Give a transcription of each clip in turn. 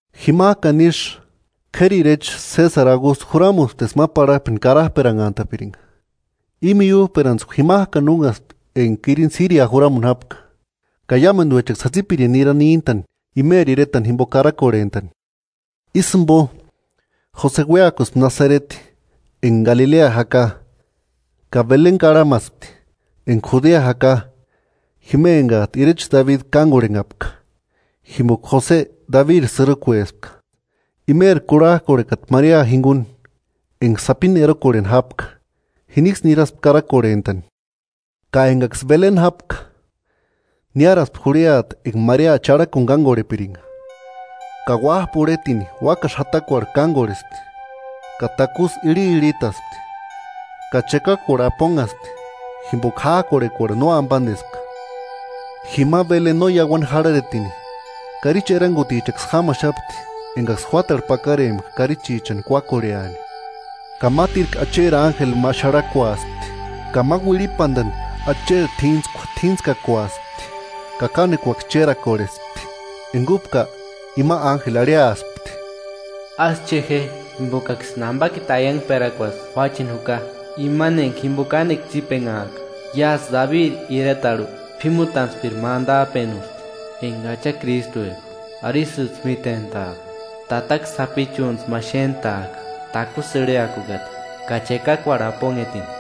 Jimajkani ísï, k'éri irecha Sésari Augustu juramuspti eska ma parhakpeni karajperanhantapiringa. I miújperantskua jimajkani únhaspti enga Kirinu Siria juramuni jápka. Ka iámenduechaksï jatsipirindi nirani níntani imeri iretani jimbo karakorhentani. Ísï jimbo, Jose uéakuspti imani iretani Nasareti, enga Galilea jaka, ka Beleni karhamaspti, enga Judea jaka, jima engajtu irecha Dabi kángorhenhapka, jimboka Jose Dabiri sïrukuespka. Imeri kurhajkorhekata Maria jinguni enga sapini erokorheni jápka, jiniksï niraspti karakorhentani. Ka engaksï Beleni jápka, niáraspti jurhiata enga Maria charhakuni kángorhepiringa. Ka uájpa urhetini úakasï jatakuarhu kángorhespti, ka takusï irhirhitaspti, ka chekakuarhu aponhaspti, jimboka jájkorhekuarhu no ambandespka. Jima Beleni no iauani jarhareti, karichi erangutichaksï jámaxapti engaksï juátarhu pakarempka karichichani kuákorheani. Ka mátirku Acheri ánjeli ma xarhakuaspti, ka ma uirhipandani Acheri t'íntskua t'íntskakuaspti; ka kánekuaksï chérakorhespti. Enga úpka, ima ánjeli arhiaspti: “Ásï che je, jimbokaksïni ambakiti aiangperakuasï juácheni juka, imani enga jimbo kánekua tsípenhaaka. Iásï Dabiri iretarhu p'ímutantspiri ma andajpenusti, enga Acha Krístueka. Arisïjtsï mítentaaka: Tataka sapichuni májtsï xéntaaka takusï irhiakukata ka chekakuarhu aponhetini.”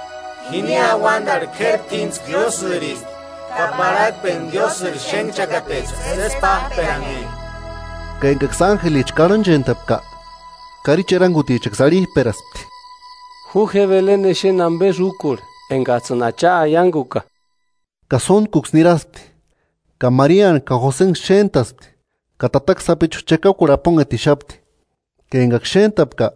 “¡Jini auandarhu k'éri t'íntskua Diósïristi! ¡Ka parhakpeni Diósïri xénhchakatecha, sési pájperanhe!” Ka engaksï ánjelicha karhanchentapka, karichi erangutichaksï arhijperaspti: –Ju je Beleni exeni ambesï úkorhe, engajtsïni Acha aianguka. Ka sóntkuksï niraspti, ka Mariani ka Josenksï xéntaspti; ka tataka sapichu chekakuarhu aponhetixapti. Ka engaksï xéntapka,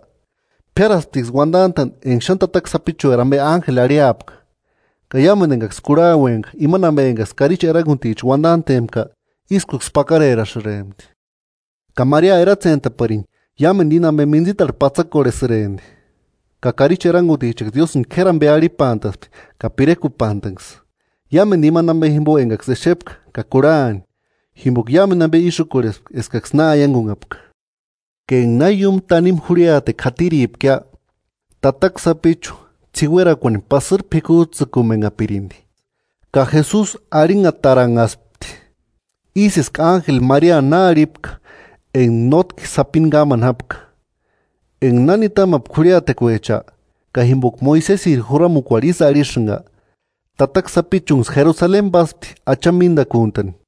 p'iárasptiksï uandantani enga xáni tataka sapichueri ambe ánjeli arhiapka. Ka iámendu engaksï kurhauempka imani ambe engaksï karichi eranguticha uandantempka ískuksï pakarerasïrempti. Ka Maria eratsentaparini iámendu íni ambe mintsitarhu patsakorhesïrempti. Ka karichi erangutichaksï Diósïni k'éri ambe arhipantaspti ka pirekupantanksï, iámendu imani ambe jimbo engaksï exepka ka kurhani, jimboka iámendu ambe ísï úkorhespka eskaksï na aiangunhapka. Ka enga na iúmu tanimu jurhiatekua jatiripkia, tataka sapichu ts'iuerakuani pasïri p'ikujtsïkumenhapirindi, ka Jesusi arhinhataranhaspti, ísï eska ánjeli Mariani na arhipka enga nótki sapini kámani jápka. Enga na nitamapkia jurhiatekuecha, ka jimboka Moisesiri juramukuarhu ísï arhisïnga, tataka sapichunksï Jerusaleni páspti Achani míndakuntani.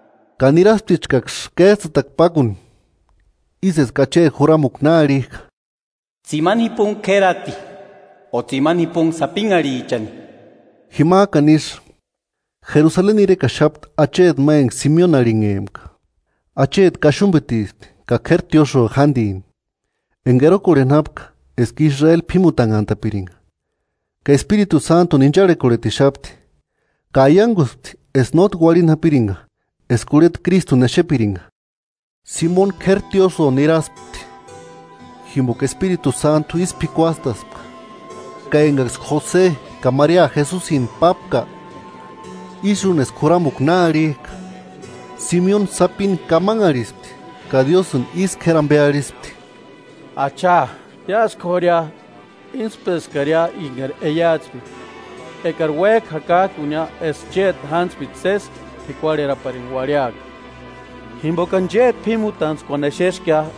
Ka nirasptichkaksï kéjtsïtakua pákuni, ísï eska Acheri juramukua na arhijka: Tsimani jipunhi k'érati o tsimani jipunhi sapinharhichani. Jimajkani isï, Jerusaleni irekaxapti acheti ma enga Simeoni arhinhempka. Acheti kaxumbitispti ka k'éri tiósïo jándini, enga erokorheni jápka eska Israeli p'ímutanhantapiringa. Ka Espiritu Sántuni incharhekorhetixapti, ka aianguspti eska nótki uarhini japiringa eska urheta Krístuni exepiringa. Simeoni k'éri tiósïo niraspti jimboka Espiritu Sántu ísï p'ikuastaspka; ka engaksï Jose ka Maria Jesusintu pápka, ísï úni eska juramukua na arhijka, Simeoni sapini kamanharhispti ka Diósïni ísï k'éri ambe arhispti: “Acha, iásï k'ória, íntspeskaria engari aiatspepka: Ekari uéjka jurajkunia eska chéti jántspiri sési p'ikuarheraparini uarhiaka. Jimbokani chéti p'ímutantskuani exeskia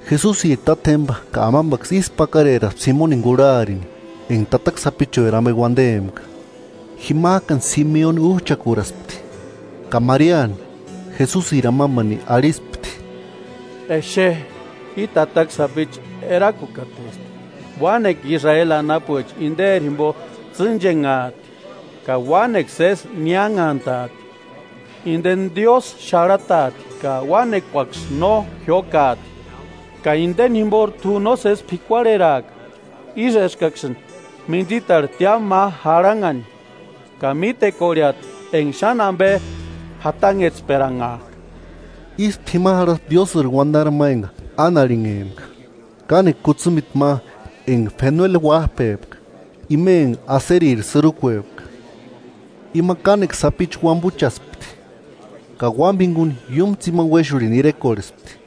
Jesusiri tátjemba ka amambaksï ísku pakareraspti Simeonini kurharini enga tataka sapichueri ambe uandempka. Jimajkani Simeoni újchakuraspti, ka Mariani, Jesusiri amambani arhispti: –Exe, i tataka sapichu erakukatesti, uánekua Israeli anapuecha inderi jimbo tsînchenhaati ka uánekua sési niánhantaati. Indeni Diósï xarhataati, ka uánekuaksï no jiókaati, ka indeni jimbori t'u nósesi p'ikuarheraaka, ísï eskaksïni mintsitarhu tiámu ma jarhanhani, ka mítekorheati enga xáni ambe jatanhetsperanhajka. Ístu jima jarhaspti Diósïri uandari ma enga Ána arhinhempka, kánekua kutsimiti ma enga Fenueli uájpepka ima enga Aseriri sïrukuepka. Ima kánekua sapichu uambuchaspti ka uámbani jinguni iúmu tsimani uéxurhini irekorhespti,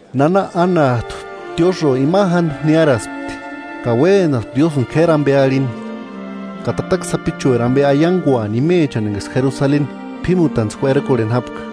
Nana Ánajtu tiósïo ima jándu niáraspti, ka uénaspti Diósïni k'éri ambe arhini ka tataka sapichueri ambe aianguani imechani engaksï Jerusaleni p'ímutantskua erokorheni jápka.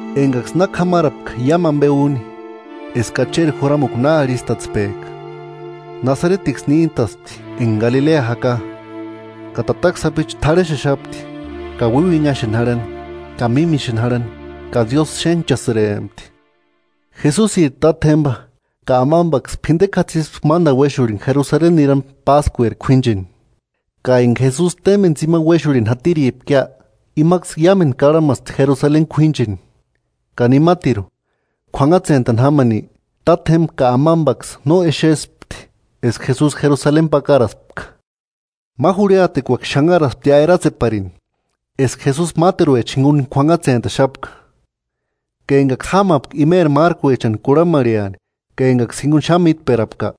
Engaksï na k'amarapka iámu ambe úni, eska Acheri juramukua na arhistatspejka, Nasaretiksï níntaspti enga Galilea jaka. Ka tataka sapichu t'arhexexapti ka uiuinhaxeni jarhani ka mímixeni jarhani, ka Diósï xénhchasïrempti. Jesusiri tátjemba ka amambaksï p'indekua jatsispti mándani uéxurhini Jerusaleni nirani Páskueri k'uíncheni. Ka enga Jesusi témbeni tsimani uéxurhini jatiripkia, imaksï iámendu karhamaspti Jerusaleni k'uíncheni. Ka nimatiru, k'uanhatsentani jámani, tátjemba ka amambaksï no exespti eska Jesusi Jerusaleni pakaraspka. Ma jurhiatekuaksï xanharasptia eratseparini eska Jesusi máteruecha jinguni k'uanhatsentaxapka, ka engaksï jámapka imeri márkuechani kurhamarheani ka engaksï jinguni xáni mítperapka,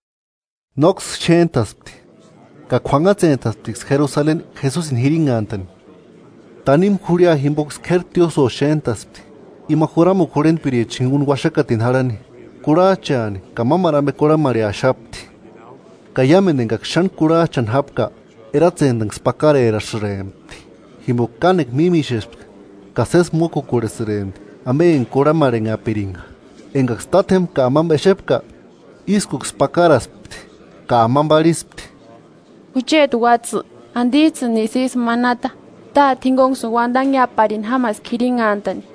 nóksï xéntaspti. Ka k'uanhatsentasptiksï Jerusaleni Jesusini jirinhantani. Tanimu jurhia jimboksï k'éri tiósïo xéntaspti, ima juramukua jurhentpiricha jinguni uaxakatini jarhani, kurhajchaani ka mámaru ambe kurhamarheaxapti; ka iámendu engaksï xáni k'urhajchani jápka eratsentanksï pakarerasïrempti, jimboka kánekua mímixespka ka sési mókukorhesïrempti ambe enga kurhamarhenhapiringa. Engaksï tátjemba ka amamba exepka, ískuksï pakaraspti; ka amamba arhispti: –Jucheti uátsï, ¿Andijtsïnisï ísï manata? Táte jingunksïni uandanheaparini jámaska jirinhantani.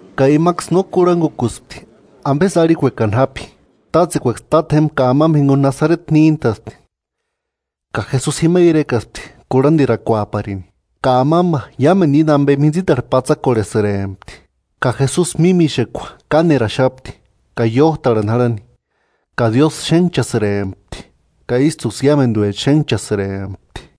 Ka imaksï no kurhangukuspti ambesï arhikuekani jápi. Tátsekuaksï tátjemba ka amamba jinguni Nasareti níntaspti, ka Jesusi jima irekaspti kurhandirakuaparini. Ka amamba iámendu íni ambe mintsitarhu patsakorhepasïrempti. Ka Jesusi mímixekua káneraxapti ka iójtarhani jarhani, ka Diósï xénhchasïrempti ka ístuksï iámenduecha xénhchanhasïrempti.